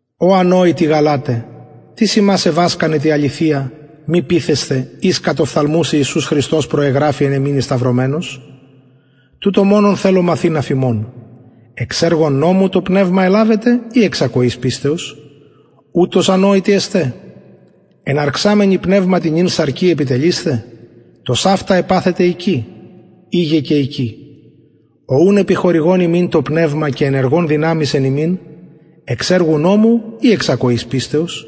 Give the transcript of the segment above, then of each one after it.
ω ανοητοι γαλαται τις υμας εβασκανεν τη αληθεια μη πειθεσθαι οις κατ οφθαλμους ιησους χριστος προεγραφη εν υμιν εσταυρωμενος τουτο μονον θελω μαθειν αφ υμων εξ εργων νομου το πνευμα ελαβετε η εξ ακοης πιστεως ουτως ανοητοι εστε εναρξαμενοι πνευματι νυν σαρκι επιτελεισθε τοσαυτα επαθετε εικη ειγε και εικη ο ουν επιχορηγων υμιν το πνευμα και ενεργων δυναμεις εν υμιν εξ εργων νομου η εξ ακοης πιστεως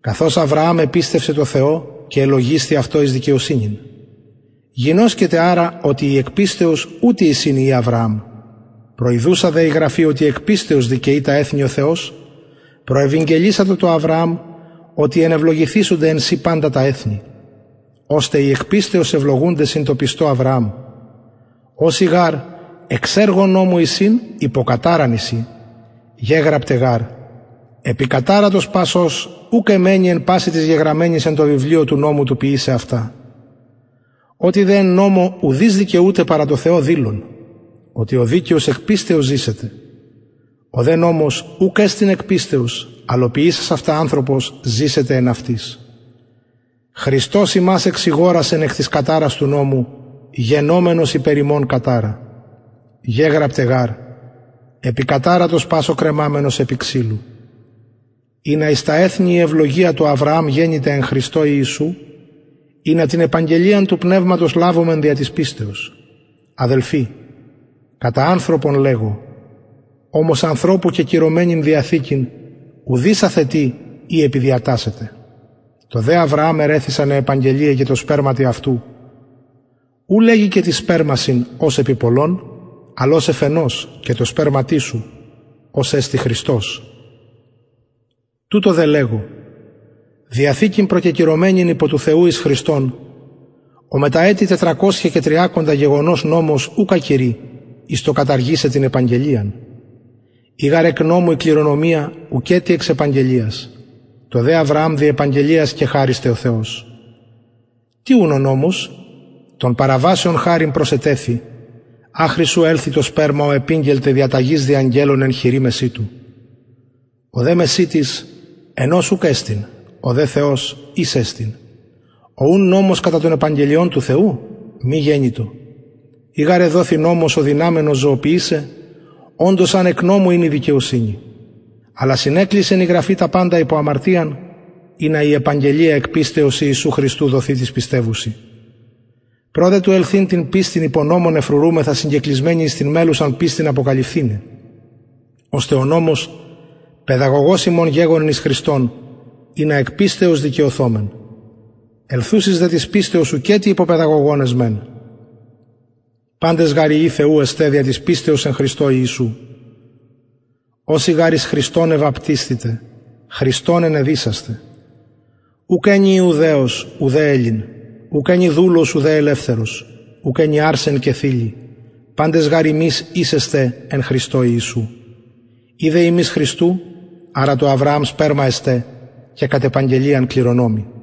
καθως αβρααμ επιστευσεν τω θεω και ελογισθη αυτω εις δικαιοσυνην γινωσκετε αρα οτι οι εκ πιστεως ουτοι εισιν υιοι αβρααμ προιδουσα δε η γραφη οτι εκ πιστεως δικαιοι τα εθνη ο θεος προευηγγελισατο τω αβρααμ οτι ενευλογηθησονται εν σοι παντα τα εθνη ωστε οι εκ πιστεως ευλογουνται συν τω πιστω αβρααμ οσοι γαρ εξ εργων νομου εισιν υπο καταραν εισιν γεγραπται γαρ επικαταρατος πας ος ουκ εμμενει εν πασιν τοις γεγραμμενοις εν τω βιβλιω του νομου του ποιησαι αυτα οτι δε εν νομω ουδεις δικαιουται παρα τω θεω δηλον οτι ο δικαιος εκ πιστεως ζησεται ο δε νομος ουκ εστιν εκ πιστεως αλλ ο ποιησας αυτα ανθρωπος ζησεται εν αυτοις χριστος ημας εξηγορασεν εκ της καταρας του νομου γενομενος υπερ ημων καταρα γεγραπται γαρ επικαταρατος πας ο κρεμαμενος επι ξυλου ινα εις τα εθνη η ευλογια του αβρααμ γενηται εν χριστω ιησου ινα την επαγγελιαν του πνευματος λαβωμεν δια της πιστεως αδελφοι κατα ανθρωπον λεγω ομως ανθρωπου κεκυρωμενην διαθηκην ουδεις αθετει η επιδιατασσεται τω δε αβρααμ ερρηθησαν αι επαγγελιαι και τω σπερματι αυτου ου λεγει και τοις σπερμασιν ως επι πολλων αλλ ως εφ ενος και τω σπερματι σου ος εστιν χριστος τουτο δε λεγω διαθηκην προκεκυρωμενην υπο του θεου εις χριστον ο μετα ετη τετρακοσια και τριακοντα γεγονως νομος ουκ ακυροι εις το καταργησαι την επαγγελιαν ει γαρ εκ νομου η κληρονομια ουκετι εξ επαγγελιας τω δε αβρααμ δι επαγγελιας κεχαρισται ο θεος τι ουν ο νομος των παραβασεων χαριν προσετεθη αχρι ου ελθη το σπερμα ω επηγγελται διαταγεις δι αγγελων εν χειρι μεσιτου ο δε μεσιτης ενος ουκ εστιν ο δε θεος εις εστιν ο ουν νομος κατα των επαγγελιων του θεου μη γενοιτο ει γαρ εδοθη νομος ο δυναμενος ζωοποιησαι οντως αν εκ νομου ην η δικαιοσυνη αλλα συνεκλεισεν η γραφη τα παντα υπο αμαρτιαν ινα η επαγγελια εκ πιστεως ιησου χριστου δοθη τοις πιστευουσιν προ του δε ελθειν την πιστιν υπο νομον εφρουρουμεθα συγκεκλεισμενοι εις την μελλουσαν πιστιν αποκαλυφθηναι ωστε ο νομος παιδαγωγος ημων γεγονεν εις χριστον ινα εκ πιστεως δικαιωθωμεν ελθουσης δε της πιστεως ουκετι υπο παιδαγωγον εσμεν παντες γαρ υιοι θεου εστε δια της πιστεως εν χριστω ιησου οσοι γαρ εις χριστον εβαπτισθητε χριστον ενεδυσασθε ουκ ενι ιουδαιος ουδε ελλην ουκ ενι δουλος ουδε ελευθερος ουκ ενι αρσεν και θηλυ παντες γαρ υμεις εις εστε εν χριστω ιησου ει δε υμεις χριστου αρα του αβρααμ σπερμα εστε και κατ επαγγελιαν κληρονομοι